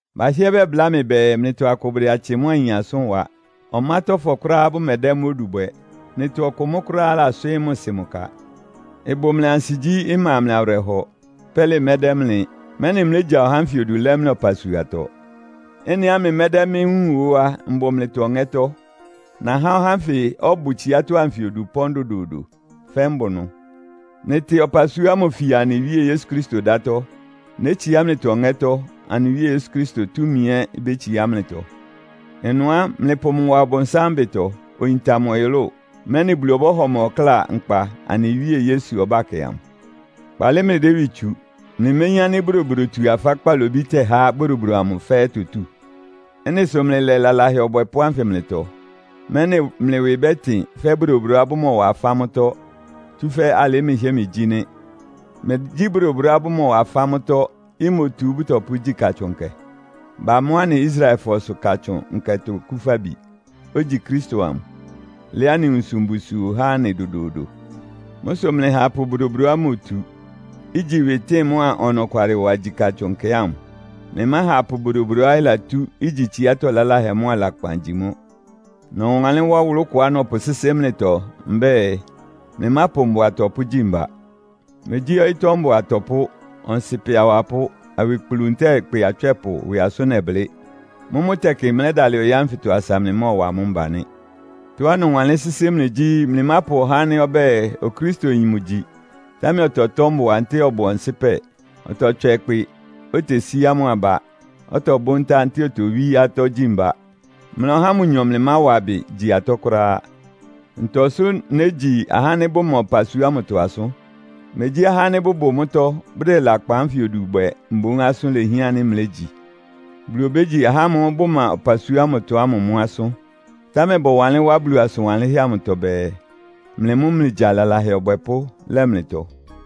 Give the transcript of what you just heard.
Bahɩ́ɛ́ bɛbláa mɩ bɛɛ, mlɩtɔ akʋ bʋdɛ atsɩ mʋ́a ayin asʋ́n wa. Ɔmátɔ́fɔ kʋ́ráá bʋmɛdɛ́ mʋ́ odu bwɛ. Mlɩtɔ ɔkʋ mʋ́ kʋ́ráá laswɩ́ɩ́ mʋ sɩ mʋ ka, ɩbʋ mlɩ ansigyí! Ɩma mlɩ awɩrɛhɔ. Pɛ́lɩ mɛdɛ́ mlɩ, mɛ́nɩ mlégya ɔhá ánfɩ odu lɛ́ mlɩ ɔpasuatɔ. Ɩ́nɩá mlɩmɛ́dɛ́ mɩ́ wúun ó á, mbʋ mlɩtɔ ɔŋɛ́tɔ́. Nahá ɔhá ánfɩ ɔbʋ tsiátɔ́ anfɩ odu ɩpɔ́n dodoodo, fɛ́ mbʋ ɩnʋ. Mlɩtɩ ɔpasua ámʋ fia anɩ Wíe Yesu Kristo dátɔ́. Nétsiá mlɩtɔ ɔŋɛ́tɔ́, anɩ Wíe Yesu Kristo túmi ɛ́ ibétsiá mlɩtɔ. Ɩnʋ á, mlɩpʋ mʋ wa Ɔbʋnsám ɩbɩtɔ, oyinta mʋ ɔyʋlʋ́ʋ, mɛ́nɩ Bulu ɔbɔ́hɔ mʋ ɔkláa nkpa anɩ Wíe Yesu ɔbákɛ amʋ. Kpaalɩ mlɩdɛ́ ɩwɩ tsu. Mlɩméyín ánɩ́ bodobodotu-afá kpalobí tɛ́há bodobodo amʋ fɛ́ɛ́ itotú? Ɩ́nɩ sʋ mlɩlɛ lalahɛ ɔbwɛpʋ́ anfɩ mlɩtɔ, mɛ́nɩ mlɩ ɩwɩ bɛ́tɩn fɛ́ bodobodoá bʋmɔwa afá mʋ́tɔ́, tsúfɛ́ alɩ́ mlɩhɩ́ɛ́ mlɩgyí nɩ́. Megyí bodobodoá bʋmɔwa afá mʋ́tɔ́, imotu bʋtɔpʋ́gyí Katsʋn Nkɛ? Bamɔ́ anɩ Israelfɔsʋ Katsʋn Nkɛtɔ Okúfabi, ogyi Kristo amʋ, lɛ́ anɩ nwunsʋ mbusuo há anɩ dodoodo. Mʋ́ sʋ mlɩha apʋ bodobodoá imotu, igyi ɩwɩtɩ́ɩn mʋ́a ɔnɔkwalɩwa gyi Katsʋn Nkɛ ámʋ. Mlɩmáha apʋ bodobodoá ɩlatú, igyi tsiátɔ́ laláhɛ mʋ́a lakpan gyi mʋ́. Nɔwanlɩ́n wá ɔwʋlʋ́ kʋá nɔpʋsɩ́sɩ́ mlɩtɔ mbɛ́ɛ, mlɩmápʋ mbʋa atɔpʋ́ gyi mba. Megyí ɔyɩ́tɔ́ mbʋa atɔpʋ́, ɔnsɩpɛ awapʋ́, awikplu ntɛ́ɛ ɩkpɩ atswɛ́pʋ ɩwɩ asʋ́n nɛblɩ́. Mʋ́mʋ́ tɛkɩ mlɛ́dalɩ ɔyɩ́ ánfɩtɔ asa mlɩmɔ́ɔwa amʋ́ mba nɩ́. Tɔ́á nɔwanlɩ́n sɩ́sɩ́ mlɩ gyí, mlɩmápʋ ɔhá ánɩ́ ɔbɛ́ɛ Okristoyin mʋgyi, támɛ ɔtɔtɔ́ mbʋa ntɛ́ɛ ɔbʋ ɔnsɩ́pɛ, ɔtɔtswɛ ɩkpɩ, otesíá mʋ aba, ɔtɔbʋ́ ntá ntɛ́ɛ otowí atɔ́ gyi mba. Mlɩa ɔhá ámʋ nyɔ mlɩmáwa ɩbɩ gyi atɔ́ kʋ́ráá. Ntɔ sʋ́ négyi ahá ánɩ́ bʋma ɔpasua ámʋtɔ asʋ́n? Megyí ahá ánɩ́ bʋbʋ mʋ́tɔ́, bʋdɛ lakpan ánfɩ odu bwɛ mboún asʋ́n lehián ánɩ́ mlégyi? Bulu obégyi ahá ámʋ́ʋ́ bʋma ɔpasua ámʋtɔ ámʋ mʋ́ asʋ́n. Támɛ bɔwanlɩ́n wá Bulu asʋn wanlɩ́nhɛ́ amʋtɔ bɛɛ, “Mlɩ mʋ́ mlɩgya lalahɛ ɔbwɛpʋ́ lɛ mlɩtɔ.”